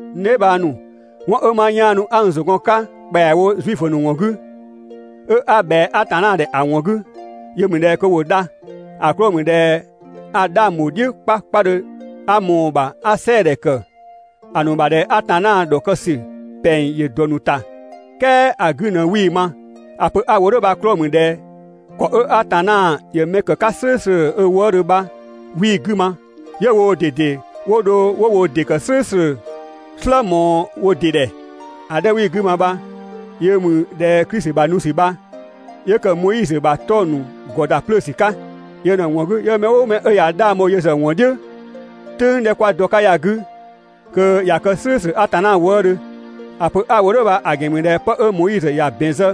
N dheebhang ‑nu, 'wɔn 'ö 'ma 'yaanu 'a n ‑zʋ gɔn‑ 'ka ‑kpɛawo Zuifö ‑nu ‑wɔn 'gü, 'ö 'a ꞊bhɛa Atanna ‑dhɛ ‑a ‑wɔn 'gü, yö ‑mü ꞊dhɛ kö ‑wo dha. ‑A 'klɔɔ‑ ‑mü ꞊dhɛ a 'dhang ‑bho "dhiʋ̈ 'kpakpadhö 'a ꞊mɔɔ‑ ‑bha 'a‑ "sɛɛdhɛ ‑kë ‑a ‑nu ‑bha ꞊dhɛ Atanna ‑dhɔkë ‑sü ‑pɛng ‑yö ‑dɔ ‑nu ‑ta, "kɛɛ ‑a 'gü ꞊në 'wii‑ ma. ‑A pö 'a‑ wo "dhʋ̈ bha‑ 'klɔɔ‑ ‑mü ꞊dhɛ ‑kɔ 'ö Atanna ‑yö mɛ ‑kë 'ka "slʋ̈ʋ̈slʋ̈ ö wëëdhö bha, 'wii‑ 'gü ma, 'yö woo ꞊dede 'wo dho 'wo wo ‑dɩ ‑kë "slʋ̈ʋ̈slʋ̈ "slë ꞊mɔɔ wo ‑dɩ ‑dhɛ. ‑A 'dhɛ 'ö 'wii‑ 'gü ma bha yö ‑mü ꞊dhɛ Klisi ‑bha nu ‑sü bha, 'yö ‑kë Moizö ‑bha 'tɔng‑ ‑nu ‑gɔ ‑da 'plöö ‑sü 'ka. Yö ꞊në‑ ‑wɔn 'gü, 'yö mɛ "ʋʋ mɛ 'ö ꞊ya 'dhang bho yö ‑zë ‑wɔn "dhiʋ̈ "tʋ̈ng 'dhɛ 'kwa dɔ‑ 'ka ya‑ 'gü, kö ꞊ya kë "slʋ̈ʋ̈slʋ̈ Atanna wëëdhö. ‑A pö 'a‑ wo "dhʋ̈ bha‑ ‑gɛn ‑mü ꞊dhɛ 'pë 'ö Moizö ‑ya ‑bɛn zë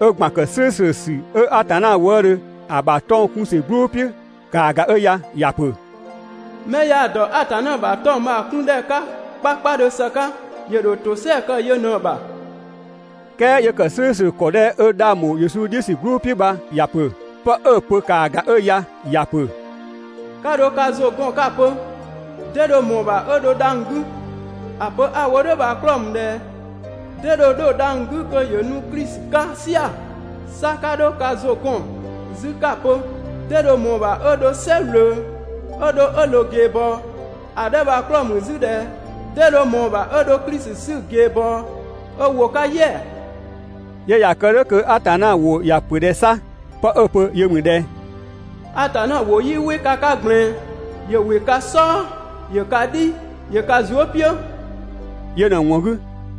'ö ‑gban ‑kë "slʋ̈ʋ̈slʋ̈ ‑sü 'ö Atanna wëëdhö ‑a ‑bha 'tɔng‑ 'kun ‑sü "gblʋʋ "piʋ̈ ‑kaa ‑ga 'ö ya. ‑Ya ‑pö: «'Mɛ yaa‑ ‑dɔ Atanna ‑bha 'tɔng‑ bha‑ 'kun ‑dhɛ 'ka 'kpakpadhö ‑së 'ka, ‑yö ‑dho ‑tosɛa kë yö ꞊në‑ ‑bha.» "Kɛɛ 'yö ‑kë "slʋ̈ʋ̈slʋ̈ ‑kɔ 'dhɛ 'ö 'dhang ‑bho Yesu "dhiʋ̈ ‑sü "gblʋʋ "piʋ̈ bha, 'pë 'ö‑ pö ‑kaa ‑ga 'ö ya, ‑ya ‑pö: «'Ka 'dho ka ‑zʋ 'gɔn 'ka‑ pö: 'Dee dho ꞊mɔɔ‑ ‑bha 'ö 'dho dhang‑ 'gü? (‑A pö 'ö‑ wo "dhʋ̈ bha‑ 'klɔɔ‑ ‑mü ꞊dhɛ: 'Dee dho 'dho dhang‑ 'gü kö ‑yö nu Klisi 'ka "sia‑?) 'Sa 'ka 'dho ka ‑zʋ 'gɔn 'zü 'ka‑ pö: ‹'Dee dho ꞊mɔɔ‑ ‑bha 'ö dho "sɛ ꞊wlöö 'ö dho 'ö ꞊loo ꞊geebɔɔ? (‑A 'dhɛ bha‑ 'klɔɔ‑ ‑mü 'zü ꞊dhɛ: 'Dee dho ꞊mɔɔ‑ ‑bha 'ö dho Klisi 'sü ꞊geebɔɔ 'ö ‑wo 'ka "yɛa‑?)›» 'Yö ꞊ya kë "dhʋ̈ kö Atanna ‑wʋ ‑ya ‑pö ꞊dhɛ 'sa? 'Pë 'ö‑ pö yö ‑mü ꞊dhɛ: «Atanna ‑wʋ 'yii "wɩ ka 'ka ꞊gblɛɛn, ‑yö ‑wɩ ka "sɔɔ, ‑yö ka "dhi, ‑yö ka zuë" "piʋ̈.» Yö ꞊në‑ ‑wɔn 'gü,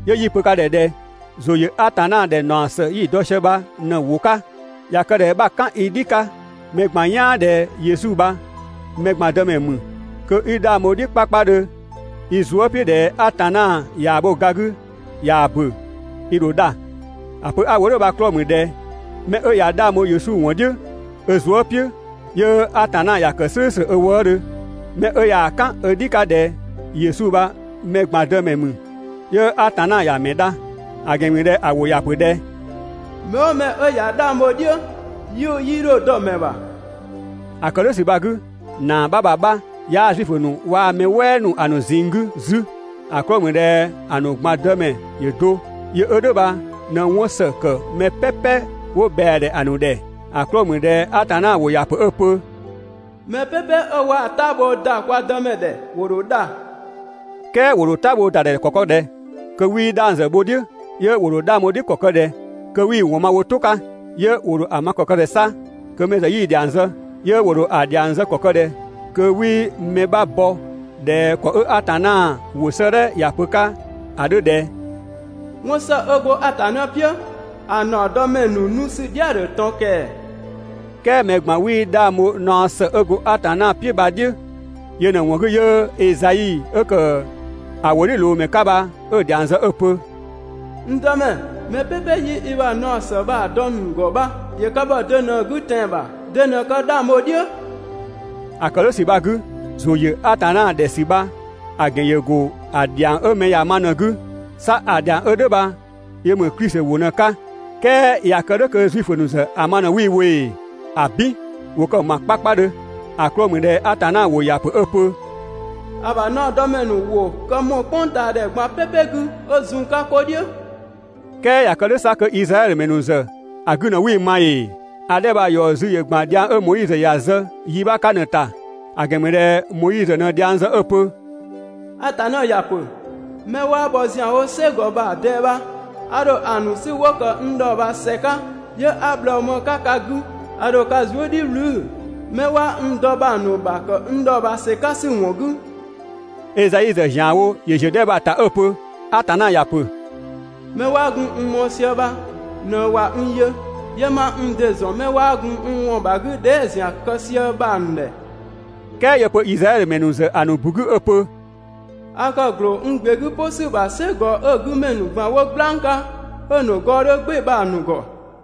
'yö 'yi‑ pö ka ‑dhɛ ꞊dhɛ: ‑Zʋ ‑yö Atanna ‑dhɛ ‑naɔ ‑së 'yi‑ dɔ sië bha ꞊në‑ ‑wʋ 'ka. ꞊Ya kë ꞊dhɛ 'bha‑ "kan i "dhi 'ka mɛ ꞊gban "yaan ꞊dhɛ Yesu bha mɛ ꞊gban Dëmɛ ‑mü, kö 'i 'dhang bho‑ "dhiʋ̈ 'kpakpadhö i zuë" "piʋ̈ ꞊dhɛ Atanna ꞊yaa‑ bho ga 'gü ꞊yaa‑ ‑bö, i ‑dho dha. ‑A pö 'a‑ wo "dhʋ̈ bha‑ 'klɔɔ‑ ‑mü ꞊dhɛ 'mɛ 'ö ꞊ya 'dhang bho Yesu ‑wɔn "dhiʋ̈ ö zuë" "piʋ̈, 'yö Atanna ‑ya kë "slʋ̈ʋ̈slʋ̈ ö wëëdhö. 'Mɛ 'ö ꞊yaa‑ "kan ö "dhi 'ka ꞊dhɛ Yesu bha mɛ ꞊gban Dëmɛ ‑mü, 'yö Atanna ‑ya ‑mɛ dha. ‑A ‑gɛn ‑mü ꞊dhɛ ‑a ‑wʋ ‑ya ‑pö ꞊dhɛ: «Mɛ "ʋʋ mɛ 'ö ꞊ya 'dhang bho‑ "dhiʋ̈, 'yiʋ̈‑ 'yii 'dho dɔ‑ ‑mɛ ‑bha.» ‑A ‑kë "dhʋ̈ ‑sü bha‑ 'gü, ‑naa 'bha ‑bha 'bha 'yaa Zuifö ‑nu waa‑ mɛ "wɛɛ ‑nu ‑a ‑nu ꞊zinng 'gü 'zü, ‑a 'klɔɔ‑ ‑mü ꞊dhɛ ‑a ‑nu ꞊gban Dëmɛ ‑yö do, yö 'ö "dhʋ̈ bha ꞊në 'wɔn ‑së ‑kë mɛ "pɛpɛ 'wo ꞊bhɛa‑ ‑dhɛ ‑a ‑nu ‑dhɛ. ‑A 'klɔɔ‑ ‑mü ꞊dhɛ Atanna ‑wʋ ‑ya ‑pö 'ö‑ pö: «Mɛ "pɛpɛ 'ö waa‑ "tabhoo ‑da kwa Dëmɛ ‑dhɛ, ‑wo ‑dho dha.» "Kɛɛ ‑wo ‑dho "tabhoo ‑da ‑dhɛ ‑kɔ kë ꞊dhɛ kö 'wii 'dhang ‑zë bho‑ "dhiʋ̈? 'Yö ‑wo ‑dho 'dhang bho‑ "dhiʋ̈ ‑kɔ kë ꞊dhɛ kö 'wii‑ ‑wɔn ma wo "tʋ 'ka? 'Yö ‑wo ‑dho ‑a ma ‑kɔ kë ꞊dhɛ 'sa kö mɛ ‑zë 'yii‑ ‑dhiang zë? 'Yö ‑wo ‑dho ‑a ‑dhiang zë ‑kɔ kë ꞊dhɛ kö 'wii mɛ 'bha bɔ ꞊dhɛ ‑kɔ 'ö Atanna ‑wʋ 'sëëdhɛ ‑ya pö‑ 'ka ‑a 'dhö ꞊dhɛ: ‹'Wɔn ‑së 'ö go Atanna "piʋ̈, ‑a ‑naɔdɔmɛ ‑nu nu ‑sü "dhia‑ ‑dhö ꞊tɔn ‑kɛɛ!› "Kɛɛ mɛ ꞊gban 'wii 'dhang bho naɔ ‑së 'ö go Atanna "piʋ̈ bha‑ "dhiʋ̈. Yö ꞊në‑ ‑wɔn 'gü 'yö Ezai 'ö ‑kë ‑a ‑wʋdhiʋ̈loomɛ 'ka bha 'ö dhiang zë 'ö‑ pö: «N Dëmɛ, mɛ "pɛpɛ 'yi i ‑bha naɔ ‑së bha‑ dɔ‑ ‑nu ‑gɔ bha, ‑yö kë ‑bhɔ de ꞊në‑ 'gü tɛan‑ ‑bha, 'de ꞊në kë 'dhang bho‑ "dhiʋ̈?» ‑A ‑kë "dhʋ̈ ‑sü bha‑ 'gü, ‑zʋ ‑yö Atanna ‑dhɛ ‑sü bha‑ ‑gɛn ‑yö go ‑a ‑dhiang 'ö mɛ ‑ya ma bha ꞊në‑ 'gü, 'sa‑ dhiang 'ö "dhʋ̈ bha yö ‑mü Klisi ‑wʋ ꞊në‑ 'ka. "Kɛɛ ꞊ya kë "dhʋ̈ kö Zuifö ‑nu ‑zë ‑a ma ꞊në 'wii‑ wo ‑ee? ‑Abin, ‑wo kë‑ ‑ma 'kpakpadhö! ‑A 'klɔɔ‑ ‑mü ꞊dhɛ Atanna ‑wʋ ‑ya pö 'ö‑ pö: «‑A ‑bha naɔdɔmɛ ‑nu ‑wʋ kë ‑mɔɔ "kpʋngtaadhɛ ꞊gban "pɛpɛ 'gü 'ö zun‑ 'ka 'ko "dhiʋ̈.» "Kɛɛ ꞊ya kë "dhʋ̈ 'sa kö Izraɛdhö ‑mɛ ‑nu ‑zë ‑a 'gü ꞊në 'wii ma ‑ee? ‑A 'dhɛ bha‑ ‑yɔ zü‑ ‑gban dhiang 'ö Moizö ‑ya zë yi 'bha 'ka ꞊në‑ ‑ta. ‑A ‑gɛn ‑mü ꞊dhɛ Moizö ꞊në dhiang zë 'ö‑ pö: «Atanna ‑ya ‑pö: 'Mɛ 'waa bhɔ ‑zianwo "sɛ ‑gɔ ‑bha ꞊dɛɛ bha, a ‑dho ‑a ‑nu 'sü 'wo ‑kë n dhɔɔbhaa ‑sɛ 'ka, 'yö 'a bhlɔɔ ma‑ 'ka ka 'gü. A ‑dho ka zuë" "dhiʋ̈ "wlü 'mɛ 'waa n dɔ bha‑ ‑nu ‑bha ‑kë n dhɔɔbhaa ‑sɛ 'ka ‑sü ‑wɔn 'gü.» Ezai ‑zë ‑zianwo ‑yö ‑ziö 'dhɛ bha‑ ‑ta 'ö‑ pö: Atanna ‑ya ‑pö: 'Mɛ 'waa gun n mɔɔ‑ sië bha ꞊në ꞊wa n yö, 'yö 'ma n ‑dɩ ‑zɔn 'mɛ 'waa gun n ‑wɔn ‑bha 'gü dhɛɛ" ‑zian kë sië bha‑ ‑nu ‑dhɛ.» "Kɛɛ 'yö‑ pö Izraɛdhö ‑mɛ ‑nu ‑zë ‑a ‑nu ‑bu 'gü 'ö‑ pö: «A kë ‑gloo n ‑gbe 'gü "pʋ ‑sü bha "sɛ ‑gɔ 'ö‑ 'gü ‑mɛ ‑nu ꞊gban 'wo "gblang 'ka, 'ö‑ ‑nu gɔɔ 'dhö "gbɩɩ‑ bha‑ ‑nu ‑gɔ.»